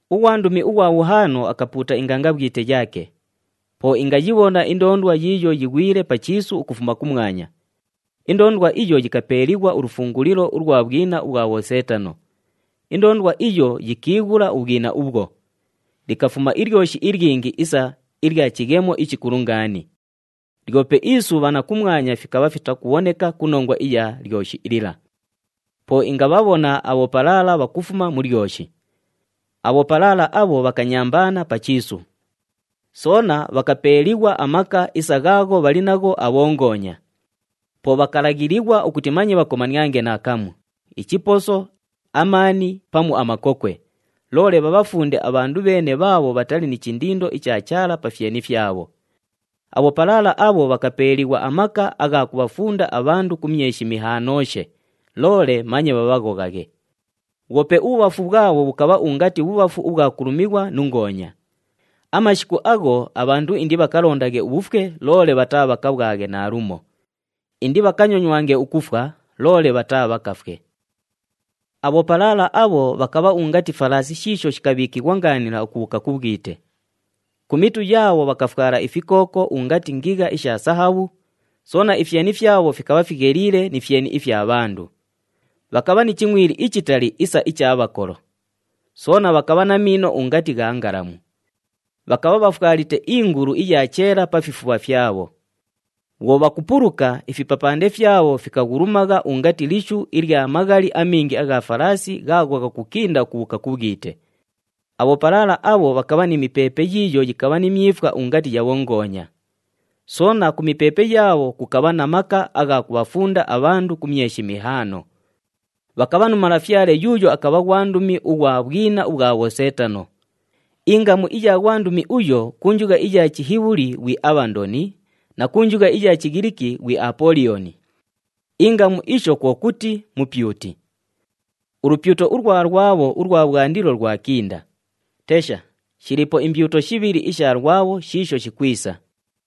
Ughwandumi ughwa bhuhaano akapuuta ingangabhwite yaake. Po ingayibhona indoondwa yiiyo yighwile pa chiisu ukufuma kumwanya. Indoondwa iyo yikapeeliighwa ulufungulilo ulwa bhwina ubhwa bhoseetano. Indoondwa iyo yikiighula ubhwina ubhwo. Likafuma ilyoshi ilyingi isa ilya chighemo ichikulu ngaani. Lyope isubha na kumwanya fikabha fitakubhoneka ku nongwa iya lyoshi lila. Po ingabhabhona abhopalaala bhakufuma mu lyoshi. Abhopalaala abho bhakanyambaana pa chiisu. Soona bhakapeeliighwa amaka isa ghaagho bhali nagho abhongoonya. Po bhakalaghilighwa ukuti manye bhakomaniange naakamu, ichiposo, amaani pamu amakokwe, loole bhabhafunde abhandu bheene bhaabho bhatali ni chindindo icha Chaala pa fyeni fyabho. Abhopalaala abho bhakapeeliighwa amaka agha kubhafunda abhandu ku myeshi mihaanooshe, loole manye bhabhaghoghaghe. Bhwope ubhubhafu bhwabho bhukabha ungati bhubhafu ubhwa kulumighwa nu ngoonya. Amashiku agho abhandu indibhakalondaghe ubhufwe loole bhataabhakabhwaghe naalumo. Indibhakanyonywange ukufwa, loole bhataabhakafwe. Abhopalaala abho bhakabha ungati falaasi shiisho shikabhiikighwa ngaanila ukubhuuka ku bhwite. Ku mitu yaabho bhakafwala ifikooko ungati ngigha isha sahabhu, soona ifyeni fyabho fikabha figheliile ni fyeni ifya bhandu. Bhakabha ni chingʼwili ichitali isa icha bhakolo. Soona bhakabha na miino ungati gha ngalamu. Bhakabha bhafwalite iingulu iya cheela pa fifubha fyabho. Bhwo bhakupuluka, ifipapande fyabho fikaghulumagha ungati lishu ilya maghali amingi agha falaasi ghaagho ghakukinda ukubhuuka ku bhwite. Abhopalaala abho bhakabha ni mipeepe yiiyo yikabha ni myifwa ungati ya bhongoonya. Soona ku mipeepe yaabho kukabha na maka agha kubhafunda abhandu ku myeshi mihaano. Bhakabha nu malafyale yuuyo akabha ghwandumi ughwa bhwina ubhwa bhoseetano. Ingamu iya ghwandumi uyo, ku njugha iya Chihibhuli ghwi Abhandoni na ku njugha iya Chighiliki ghwi Apooliyoni. Ingamu isho kwo kuti, “Mupyuti.” Ulupyuto ulwa “Lwabho” ulwa bhwandilo lwakinda. Tesha! Shiliipo imbyuto shibhili isha “Lwabho” shiisho shikwisa.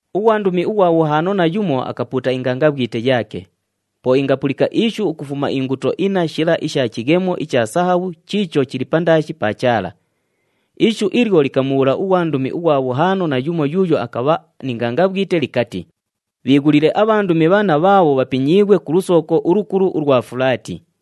Ughwandumi ughwa bhuhaano na yumo akapuuta ingangabhwite yaake. Po ingapulika ishu ukufuma inguto inna shila isha chighemo icha sahabhu chiicho chili pandaashi pa Chaala. Ishu ilyo likamubhuula ughwandumi ughwa bhuhaano na yumo yuuyo akabha ni ngangabhwite likati, “Bhiighulile abhandumi bhanna bhaabho bhapinyiighwe ku lusooko ulukulu ulwa Fulaati.”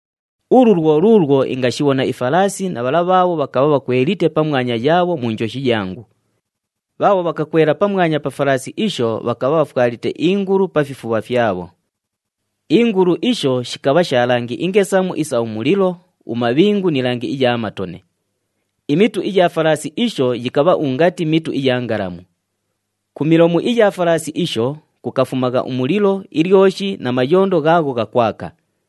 Ulu lwo luulwo ingashibhona ifalaasi na bhala bhaabho bhakabha bhakwelite pamwanya yaabho mu njoshi yangu. Bhaabho bhakakwela pamwanya pa falaasi isho bhakabha bhafwalite iingulu pa fifubha fyabho. Iingulu isho shikabha sha langi ingesamu isa umulilo, umabhingu ni langi iya matone. Imitu iya falaasi isho yikabha ungati mitu iya ngalamu. Ku milomu iya falaasi isho, kukafumagha umulilo, ilyoshi na mayondo ghaagho ghakwaka.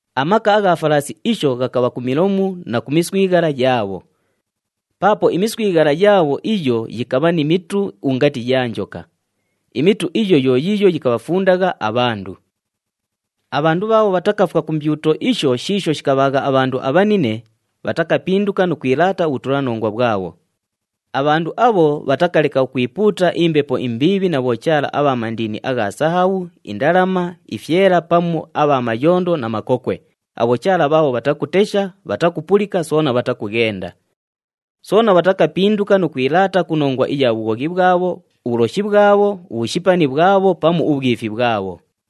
Amaka agha falaasi isho ghakabha ku milomu na ku miswighala yaabho. Paapo imiswighala yaabho iyo yikabha ni mitu ungati ya njoka. Imitu iyo yo yiiyo yikabhafundagha abhandu. Abhandu bhaabho bhatakafwa ku mbyuto isho shiisho shikabhaagha abhandu abhanine, bhatakapinduka nu kwilaata ubhutulanongwa bhwabho. Abhandu abho, bhatakaleka ukwipuuta imbepo imbiibhi na bhochaala abha mandini agha sahabhu, indalama, ifyela pamu abha mayondo na makokwe, abhochaala bhaabho bhatakutesha, bhatakupulika soona bhatakughenda. Soona bhatakapinduka nu kwilaata ku nongwa iya bhughoghi bhwabho, ubhuloshi bhwabho, ubhushipani bhwabho pamu ubhwifi bhwabho.